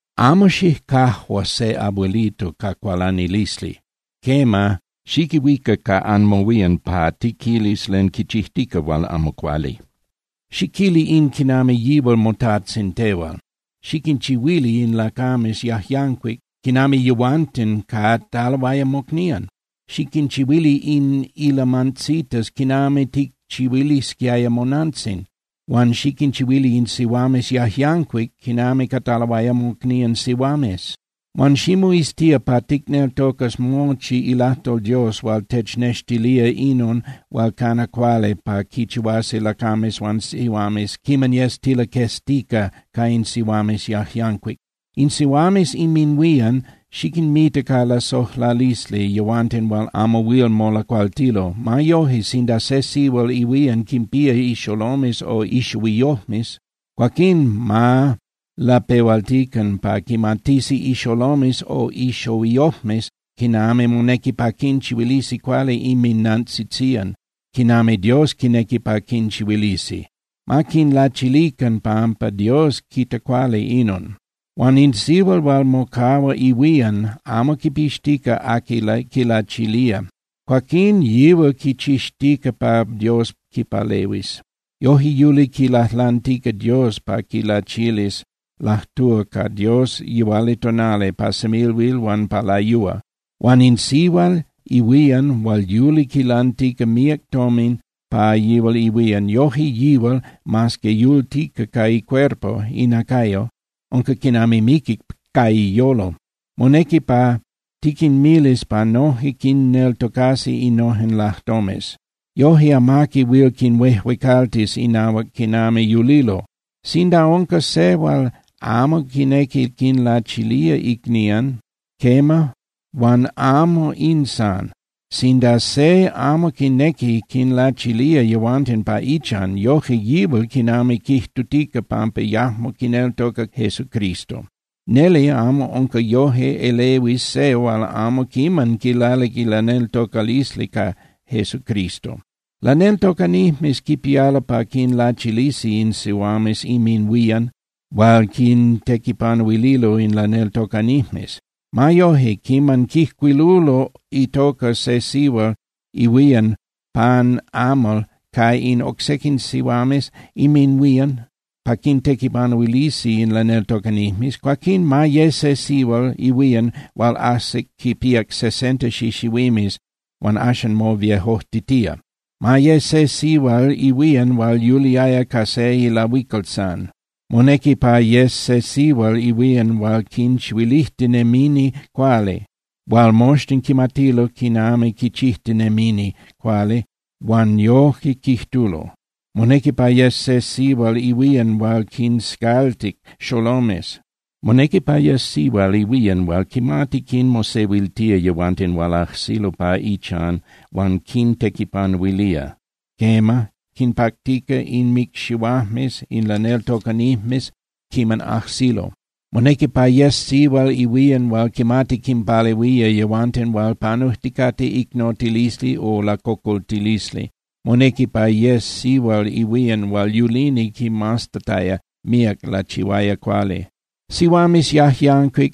Amo xicajua se abuelito ca cualanilisli. Quema, xiquihuica ca anmohuían pa tiquilis len quichijtica hual amo cuali. Xiquili in quinami yihual motajtzin tehual. Xiquinchihuili in lacames yajyancuic quinami yehuanten cataloaya mocnían. Xiquinchihuili in ilamantzitas quinami ticchihuilisquiaya monantzin huan xiquinchihuili in sihuames yajyancuic quinami cataloaya mocnían sihuames. Huan ximoiztía pa ticneltocas mochi ilajtol Dios hual technextilía inon hual cana cuali pa quichihuasi lacames huan sihuames quiman yes tilaqueztica ca in sihuames yajyancuic. In sihuames inminhuían xiquinmita ca lasojlalisli yehuanten hual amo huil molacualtilo. Ma yoje, sinda se sihual ihuían quinpía ixolomes o ixohuiyojmes, cuaquín ma lapehualtican pa quimatisi ixolomes o ixohuiyojmes quinami monequi pa quinchihuilisi cuali inminnantzitzían, quinami Dios quinequi pa quinchihuilisi. Ma quinlachilican, pampa Dios quita cuali inon. Huan in sihual hual mocahua ihuían, amo quipixtica aqui quilachilía, cuaquín yihual quichixtica pa Dios quipalehuis. Yoje yuli quilajlantica Dios pa quilachilis, lajtúa ca Dios yihualitonali, pa semilhuil huan pa layúa. Huan in sihual ihuían hual yuli quilantica míac tomin pa yihual ihuían, yoje yihual, mas que yultica ca icuerpo (inacayo), unca quinami miquic ca iyolo. Monequi pa tiquinmilis pa noje quinneltocasi innojen lajtomes. Yoje amaqui huil quinhuejuecaltis inahuac quinami yulilo. Sinda unca se hual amo quinequi quinlachilía icnían, quema, huan amo in san, sinda se amo quinequi quinlachilía yehuanten pa ichan, yoje yihual quinami quijtutica pampa yajmo quineltoca Jesucristo. Neli amo unca yoje elehuis se hual amo quiman quilalic ilaneltocalisli ca Jesucristo. Laneltocanijmes quipialo pa quinlachilisi in sihuames inminhuían hual quintequipanuililo in laneltocanijmes. Ma yoje, quiman quijcuilulo itoca se sihual ihuían pan amal ca in oc sequin sihuames inminhuían pa quintequipanuilisi in laneltocanijmes, cuaquín ma ye se sihual ihuían hual ajsic quinpíac sesenta xixihuimes huan axan moviejojtitía. Ma ye se sihual ihuían hual yuliaya ca se ilahuical san. Monequi pa yes se sihual ihuían hual quinchihuilijtinemini cuali, hual moxtin quimatilo quinami quichijtinemini cuali huan yoje quijtulo. Monequi pa yes se sihual ihuían hual quinscaltic xolomes. Monequi pa yes sihual ihuían hual quimati quinmosehuiltía yehuanten hual ajsilo pa ichan huan quintequipanuilía, quema, quinpactica inmicxihuajmes in laneltocanijmes quiman ajsilo. Monequi pa yes sihual ihuían hual quimati quinpalehuía yehuanten hual panujticate icnotilisli o lacocoltilisli. Monequi pa yes sihual ihuían hual yulini quimaztataya míac lachihuaya cuali. Sihuames yajyancuic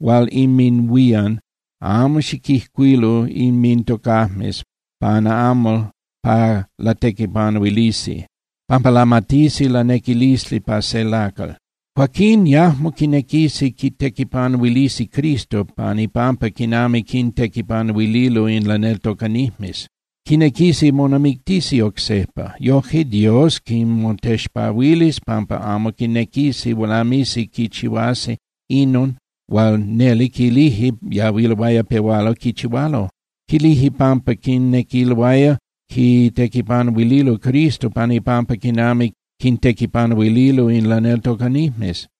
hual inminhuían, amo xiquijcuilu inmintocajmes pan amal pa latequipanuilisi, pampa lamatisi lanequilisli pa se lacal. Cuaquín yajmo quinequisi quitequipanuilisi Cristo pan ipampa quinami quintequipanuililo in laneltocanijmes. Quinequisi monamictisi oc sejpa. Yoje Dios quinmotexpahuilis pampa amo quinequisi lamisi quichihuasi inon hual neli quilije yahuiloaya pehualo quichihualo. Quilije pampa quinequiloaya quitequipanuililo Cristo pan ipampa quinami quintequipanuililo in laneltocanijmes.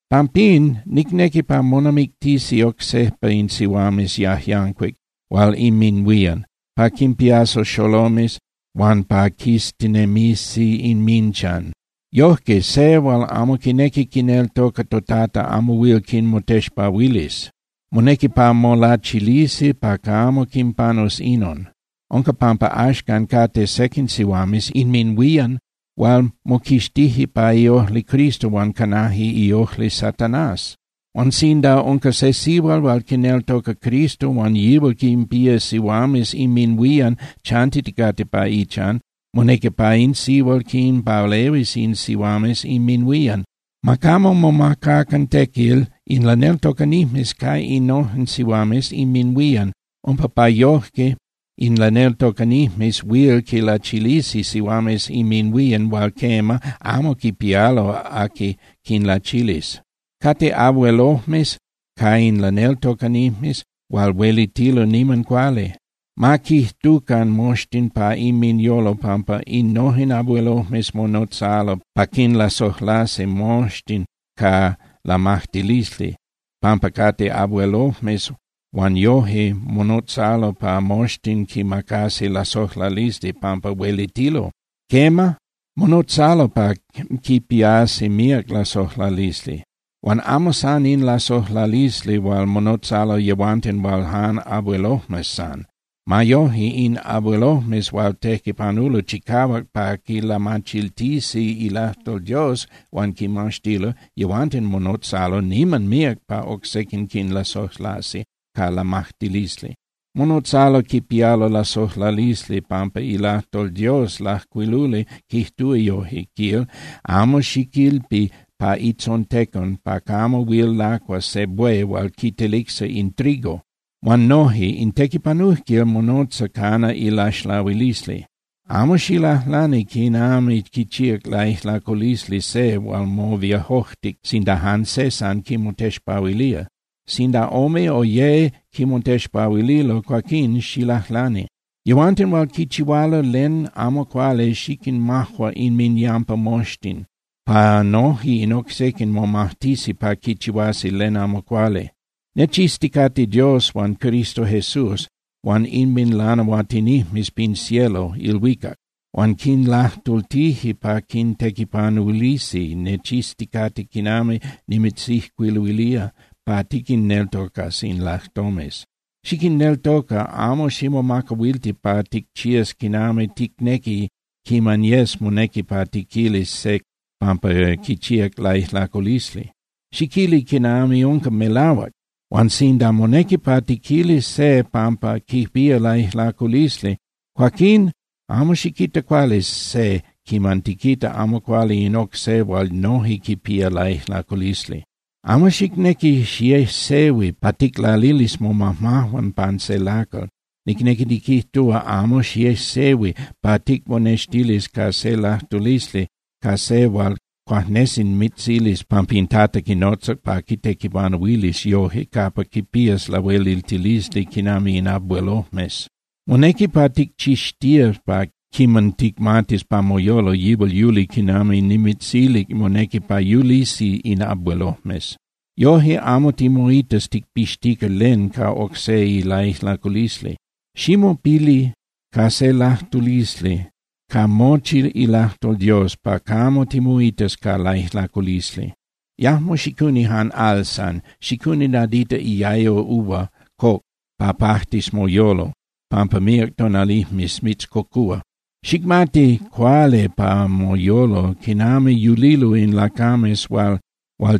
Pampín, nicnequi pa monamictisi oc sejpa in sihuames yajyancuic hual inminhuían, pa quinpiasi xolomes, huan pa quiztinemisi inminchan. Yojque, se hual amo quinequi quineltoca toTata amo huil quinmotexpahuilis. Monequi pa molachilisi pa camo quinpanus inon. Unca pampa axcan cate sequin sihuames inminhuían hual moquixtije pa iojli Cristo huan canaje iojli Satanás. Huan sinda unca se sihual hual quineltoca Cristo huan yihual quinpía sihuames inminhuían chantiticate pa ichan, monequi pa in sihual quinpalehuis in sihuames inminhuían. Ma camo momacacan tequil in laneltocanijmes ca innojen sihuames inminhuían umpa pa yoje in laneltocanijmes huil quinlachilisi sihuames inminhuían hual quema, amo quipialo aqui quinlachilis. Cate abuelojmes ca in laneltocanijmes hual huelitilo niman cuali. Ma quijtucan moxtin pa inminyolo pampa innojen abuelojmes monotzalo pa quinlasojlasi moxtin ca lamajtilisli pampa cate abuelojmes huan noje monotzalo pa moxtin quinmacasi lasojlalisli pampa huelitilo. Quema, monotzalo pa quipiasi míac lasojlalisli, huan amo san in lasojlalisli hual monotzalo yehuanten hual jan abuelojmes san. Ma yoje, in abuelojmes hual tequipanulo chicahuac pa quilamachiltisi ilajtol Dios huan quimaxtilo, yehuanten monotzalo niman míac pa oc sequin quinlasojlasi ca lamajtilisli. Monotzalo quipialo lasojlalisli pampa ilajtol Dios lajcuiluli quijtúa yoje, quil: “Amo xiquilpi pa itzontecon pa camo huil lacuas se buey hual quitelicsa in trigo.” Huan noje: “In tequipanujquil monotza cana ilaxlahuilisli.” Amo xilajlani quinami quichíac laijlaculisli se hual moviejojtic sinda jan se san quimotexpahuilía. Sinda ome o ye quimotexpahuililo, cuaquín xilajlani. Yehuanten hual quichihualo len amo cuali xiquinmajua inminyampa moxtin, pa noje in oc sequin momajtisi pa quichihuasi len amo cuali. Nechizticate Dios huan Cristo Jesús huan inminlanahuatinijmes pin cielo (ilhuicac) hual quinlajtultije pa quintequipanuilisi, nechizticate quiman nimitzijcuiluilía pa tiquinneltocas in lajtomes. Xiquinneltoca, amo ximomacahuilti pa ticchías quinami ticnequi quiman yes monequi pa tiquilis se pampa quichíac laijlaculisli. Xiquili quinami unca melahuac. Huan sinda monequi pa tiquilis se pampa quipía laijlaculisli, cuaquín amo xiquita cuali se quiman tiquita amo cuali in oc se hual noje quipía laijlaculisli. Amo xicnequi xiejsehui pa ticlalilis momajmajuan pan se lacal. Nicnequi niquijtúa, amo xiejsehui pa ticmonextilis ca se lajtulisli ca se hual cuajnesi mitzilis pampa in Tata quinotzac pa quitequipanuilis yoje capa quipías lahueliltilisli quinami in abuelojmes. Monequi pa ticchixtías pa quiman ticmatis pa moyolo yihual yuli quinami nimitzilic monequi pa yulisi in abuelojmes. Yoje amo timoitas ticpixtica len ca oc se ilaijlaculisli. Ximopili ca se lajtulisli ca mochi ilajtol Dios pa camo timoitas ca laijlaculisli. Yajmo xicuni jan al san. Xicuni nadita iayo uva coc pa pajtis moyolo, pampa míac tonalijmes mitzcocúa. Xicmati cuali pa moyolo quinami yulilo in lacames hual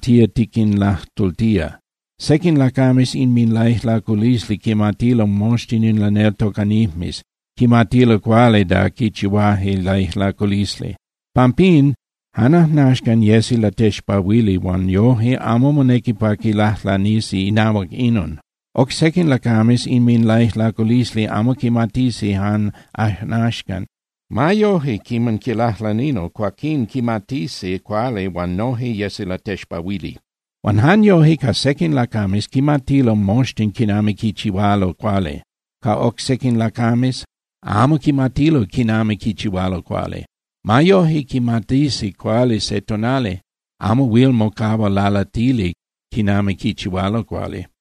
tía tiquinlajtultía. Sequin lacames inminlaijlaculisli quimatilo moxtin in laneltocanijmes, quimatilo cuali da quichihuaje laijlaculisli. Pampín jan ajnaxcan yesi latexpahuili huan yoje amo monequi pa quilajlanisi inahuac inon. Oc sequin lacames inminlaijlaculisli amo quimatisi jan ajnaxcan. Ma yoje, quiman quilajlanilo, cuaquín quimatisi cuali huan noje yesi latexpahuili. Huan jan yoje, ca sequin lacames quimatilo moxtin quinami quichihualo cuali. Ca oc sequin lacames amo quimatilo quinami quichihualo cuali. Ma yoje, quimatisi cuali se tonali, amo huil mocahua lalatili quinami quichihualo cuali.